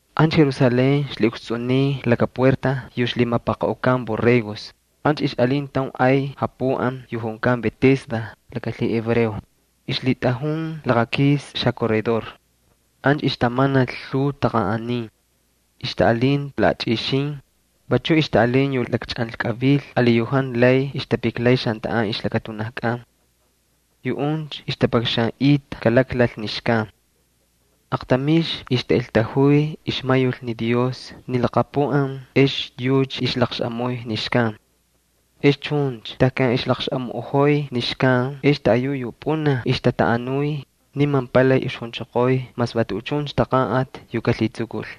Ancha Jerusalén ixlhiꞌukstsꞌuniy laka puerta yu lhimapaqaꞌukan Borregos, ancha ixꞌalin taun ay japuꞌan yu junkan Betesda laka lhihebreo. Ixlhitꞌajun laqakis xacorredor. Ancha ixtamanal lhuu taqanꞌanin. Ixtaꞌalinta laꞌachꞌixin, vachu ixtaꞌalin yu lakchꞌanlkꞌavil ali yu jantu lay ixtapiklay xantaꞌan ixlakatunajkꞌan. Yuꞌuncha ixtapakxanꞌita kalaklal ni xkan. [Aqtamixna ixtaꞌeltajuy ixmayul ni Dios ni laqapuꞌan ex yucha ixlaqxaꞌamuy ni xkan. Ex chuncha tejkan ixlaqxaꞌamuꞌojoy ni xkan ex taꞌayu yu pꞌunaj ixtataꞌanuy, niman palay ixjunchoqoy mas va tuꞌuchuncha taqanꞌati yu kalhitsukul.]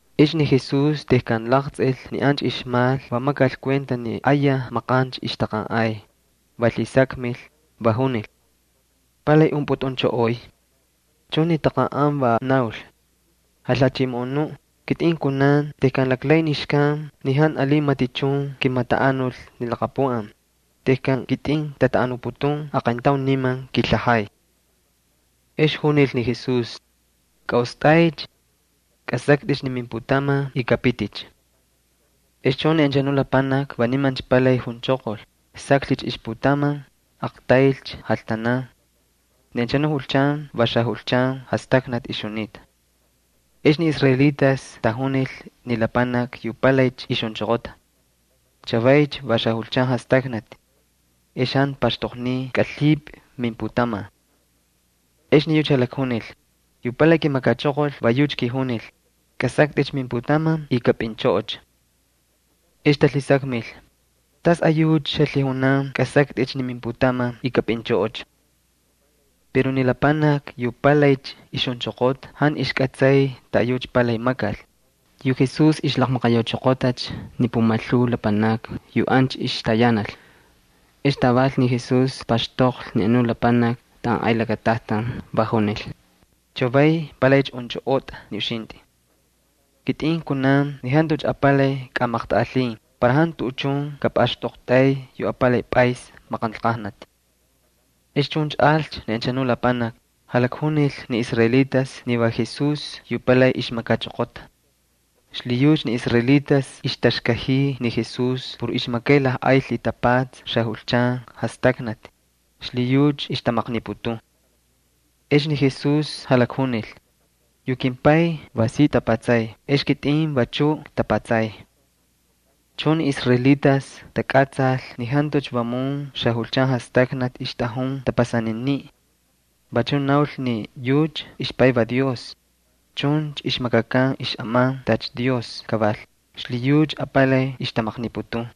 Ex ni Jesús tejkan laqtsꞌil ni ancha ixmal va makal kuenta ni ayaj maqancha ixtaqanꞌay, va lhisakmil, va junil: —¿Palay unpꞌutꞌunchꞌoꞌoy? Chuncha ni taqanꞌan va naul: —Jalhachimoꞌonuꞌ, kitꞌin kunan tejkan laklay ni xkan, ni jantu alin matichun kimataꞌanul ni laqapuꞌan. Tejkan kitꞌin ktaꞌanuputun, aqayntaun niman kilhajay. Ex junil ni Jesús: —Kꞌaꞌostꞌaycha. Kꞌasaktꞌicha ni mimputaman y kꞌapiticha. Ex chuncha ni anchanu lapanaki va nimancha palay junchoqol, saklhicha ixputaman, aqtaylcha jaltanan. Ni anchanu julchan va xajulchan jastaknati ixjunita. Ex ni israelitas tajunil ni lapanaki yu palaycha ixjunchoqota: —Chavaycha va xajulchan jastaknati. Ex jantu paxtoqniy kꞌalhipꞌi mimputaman. Ex ni yucha jalakjunil: —Yu palay kimakachoqol va yucha kijunil: “Kꞌasaktꞌicha ni mimputaman y kapꞌinchꞌoꞌocha.” Ex talhisakmil: —¿Tasꞌayucha xalhijunan kꞌasaktꞌicha ni mimputaman y kapꞌinchꞌoꞌocha? Pero ni lapanaki yu palaycha ixjunchoqota jantu ixkꞌatsay taꞌayucha palay makal. Yu Jesús ixlaqmaqayauchoqotacha ni pumalhuu lapanakni yu ancha ixtayanal. Ex taval ni Jesús paxtoqlhi ni anuꞌ lapanaki taꞌan ay lakatajtan, va junil: —Chavay palaycha unchꞌoꞌotꞌa ni uxintꞌi. Kitꞌin kunan ni jantucha apalay kꞌamaqtꞌaꞌalhin para jantu tuꞌuchun kapꞌaxtꞌoqtꞌay yu apalay pꞌays maqanlqajnati. Ex chuncha alcha ni anchanu lapanaki, jalakjunil ni israelitas ni va Jesús yu palay ixmakachoqota. Xlhiyucha ni israelitas ixtaxkajiy ni Jesús por ixmakay lajꞌay lhitapatsa xajulchan jastaknati, xlhiyucha ixtamaqniputun. Ex ni Jesús jalakjunil: —Yu kimPay va si tapatsay ex kitꞌin vachuꞌ ktapatsay. Chuncha ni israelitas takꞌatsal ni jantucha vamun xajulchan jastaknati ixtꞌajun tapasaniniꞌ. Vachuꞌ naul ni yucha ixPay va Dios. Chuncha ixmakakan xꞌaman tacha Dios kaval, xlhiyucha apalay ixtamaqniputun.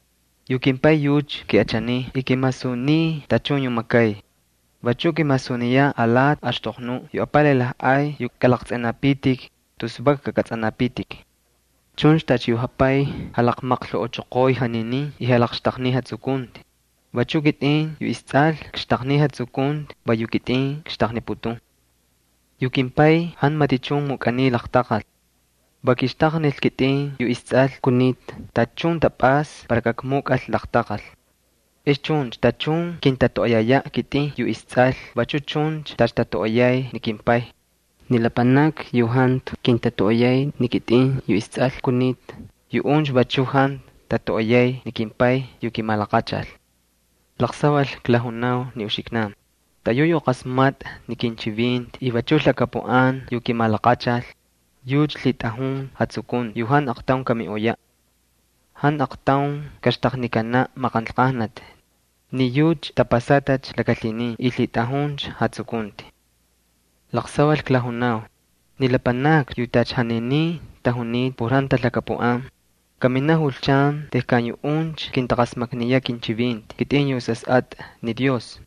Yu kimPay yucha kiꞌachaniy y kimasuniy tachun yu makay. Vachuꞌ kimasuniyaꞌ alati axtoqnuꞌ yu apalay lajꞌay yu kꞌalaqtsꞌinapitik, tus vak kakꞌatsꞌanapitik. Chuncha tacha yu jaPay jalakmajkujuchoqoy janinin y jalaqxtaqniy jatsukunti, vachuꞌ kitꞌin yu isTsꞌal kxtaqniy jatsukunti va yu kitꞌin kxtaqniputun. Yu kimPay jantu matichun mukꞌaniy laqtaqal. Va kixtaqnil kitꞌin yu isTsꞌal kunita tachun tapꞌasta para kakmukꞌal laqtaqal. Ex chuncha tachun kintatoꞌoyayaꞌ kitꞌin yu isTsꞌal vachu chun tacha tatoꞌoyay ni kimPay. Ni lapanakni yu jantu kintatoꞌoyay ni kitꞌin yu isTsꞌal, yuꞌuncha vachu jantu tatoꞌoyay ni kimPay yu kimalaqachal. ’Laqsaval klajunau ni uxiknan: Taꞌayu yu qasmatꞌa ni kinchivinti y vachu lhakapuꞌan yu kimalaqachal, yucha lhitꞌajun jatsukunti yu jantu aqtaun kamiꞌoyaꞌ. Jantu aqtaun kaxtaqnikanaꞌ maqanlqajnati, ni yucha tapasatacha laka lhinin y lhitꞌajuncha jatsukunti. Laqsaval klajunau, ni lapanakni yu tacha janinin tajunita por jantu talhakapuꞌan, kaminaꞌ julchan tejkan yuꞌuncha kintaqasmakniyaꞌ kinchivinti kitꞌin yu Sasꞌatꞌa Dios.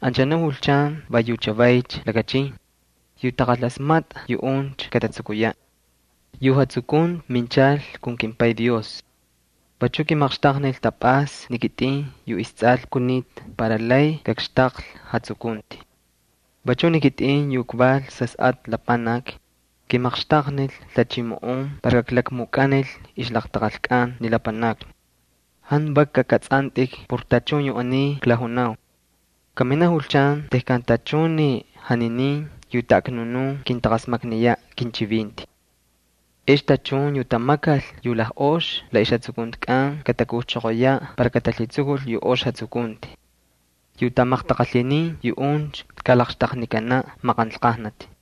Anchanu julchan va yu chavaycha lakachin. Yu taqalasmatꞌa, yuꞌuncha katatsukuyaꞌ. Yu jatsukunti minchal kun kimPay Dios. Vachu kimaqxtaqnil tapꞌasta ni kitꞌin yu isTsꞌal kunita para lay kakxtaqlhi jatsukunti. Vachuꞌ ni kitꞌin yu kval Sasꞌatꞌa Lapanaki, kimaqxtaqnil lhachimoꞌon para kaklakmukꞌanil ixlaqtaqalkꞌan ni lapanakni. Jantu vak kakꞌatsꞌantꞌik por tachun yu aniy klajunau. Kaminaꞌ julchan tejkan tachun ni janinin yu taꞌaknunun kintaqasmakniyaꞌ kinchivinti. Ex tachun yu tamakal yu lajꞌoxi la ixjatsukuntikꞌan katakujchoqoyaꞌ para katalhitsukul yu ox jatsukunti. Yu tamaqtaqalhinin yuꞌuncha kalaqxtaqnikanaꞌ maqanlqajnati.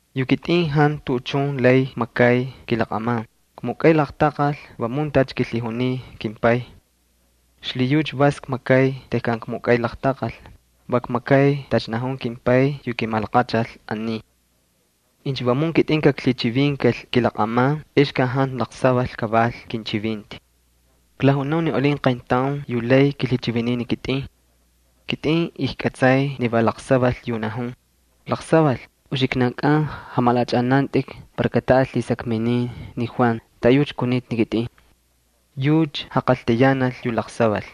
’Yu kitꞌin jantu tuꞌuchun lay kmakay kilaqꞌaman, kmukꞌay laqtaqal vamun tacha kilhijuniy kimPay. Xlhiyucha vas kmakay tejkan kmukꞌay laqtaqal, va kmakay tacha najun kimPay yu kimalaqachal aniy. Incha vamun kitꞌin kaklhichivinkal kilaqꞌaman ex ka jantu laqsaval kaval kinchivinti. Klajunau ni alin qayntaun yu lay kilhichiviniy ni kitꞌin. Kitꞌin ijkꞌatsay ni va laqsaval yu najun. Laqsaval uxiknankꞌan jamalaꞌachꞌanantꞌik para kataꞌal lhisakminin ni Juan taꞌayucha kunita ni kitꞌin. Yucha jaqaltayanal yu laqsaval.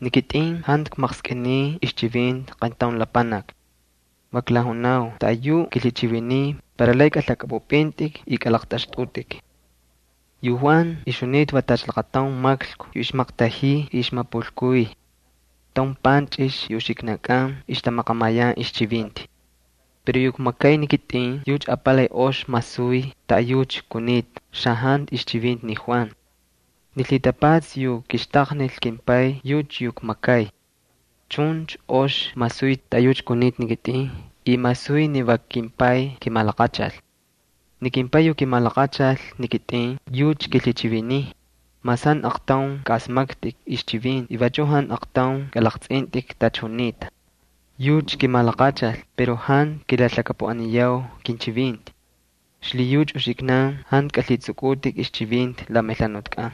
Ni kitꞌin jantu kmaqskꞌiniy ixchivinti qayntaun lapanaki. Va klajunau taꞌayuꞌ kilhichiviniy para lay kꞌalhakꞌapꞌupꞌintꞌik y kꞌalaqtꞌaxtꞌutꞌik. ’Yu Juan ixjunita va tacha laqataun maklku yu ixmaqtajiy y ixmapulkuy. Taun panchꞌix yu uxiknan ixtamaqamayan ixchivinti. Pero yu kmakay ni kitꞌin yucha apalay ox masuy taꞌayucha kunita xajantu ixchivinti ni Juan. Ni lhitapatsa yu kixtaqnil kimPay va yucha yu kmakay. Chuncha ox masuy taꞌayucha kunita ni kitꞌin y masuy ni va kimPay kimalaqachal. Ni kimPay yu kimalaqachal ni kitꞌin yucha kilhichiviniy, mas jantu aqtaun kꞌaꞌasmaktꞌik ixchivinti y vachu jantu aqtaun kꞌalaqtsꞌintꞌik tacha junita. Yucha kimalaqachal pero jantu kilalhakapuꞌaniyau kinchivinti. Xlhiyucha uxiknan jantu kalhitsꞌukꞌutꞌik ixchivinti la melhanutkꞌan.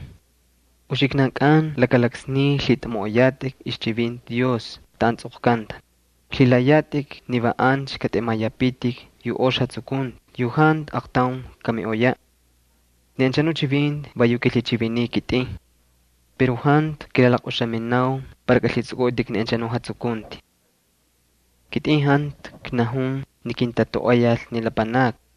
Uxiknankꞌan laka laksniy lhitꞌamoꞌoyatꞌik ixchivinti Dios taꞌan tsꞌoqkanta, lhilayatꞌik ni va ancha katꞌemayapitik ni jatsukunti yu jantu aqtaun kamiꞌoyaꞌ. Ni anchanu chivinti va yu kilhichiviniy ni kitꞌin. Pero jantu kilalaqꞌuxaminau para kꞌalhitsꞌukꞌutꞌik ni anchanu jatsukunti. ’Kitꞌin jantu knajun ni kintatoꞌoyal ni lapanakni.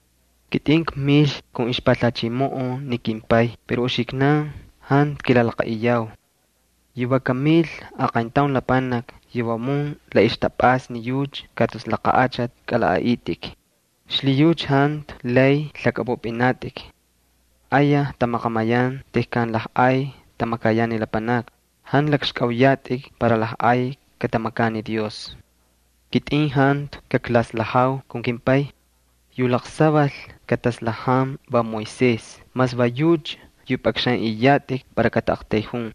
Kitꞌin kmil kun ixpalhachimoꞌon ni kimPay pero uxiknan jantu kilalaqaꞌiyau. Yu va kamil aqayntaun lapanaki yu vamun la ixtapꞌasta ni yucha, ka tus laqa achati kꞌalaꞌaꞌitꞌik. Xlhiyucha jantu lay lhakꞌapꞌupꞌinatꞌik. Ayaj tamaqamayan tejkan lajꞌay tamakayan ni lapanakni, jantu lakxkꞌauyatꞌik para lajꞌay katamakan ni Dios. Kitꞌin jantu kaklaslajau kun kimPay. Yu laqsaval kataslajan va Moisés mas va yucha yu pꞌakxanꞌiyatꞌik para kataꞌaqtayjun.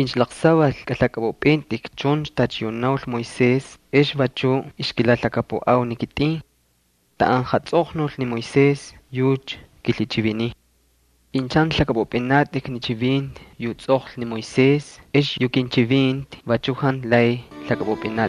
Incha laqsaval kꞌalhakꞌapꞌupꞌintꞌik chuncha tacha yu naul ni Moisés ex vachuꞌ ixkilalhakapuꞌau ni kitꞌin. Taꞌan jatsꞌoqnul ni Moisés yucha kilhichiviniy. Incha jantu lhakꞌapꞌupꞌinatꞌik ni chivinti yu tsꞌoqlhi ni Moisés ex yu kinchivinti vachu jantu lay lhakꞌapꞌupꞌinatꞌik.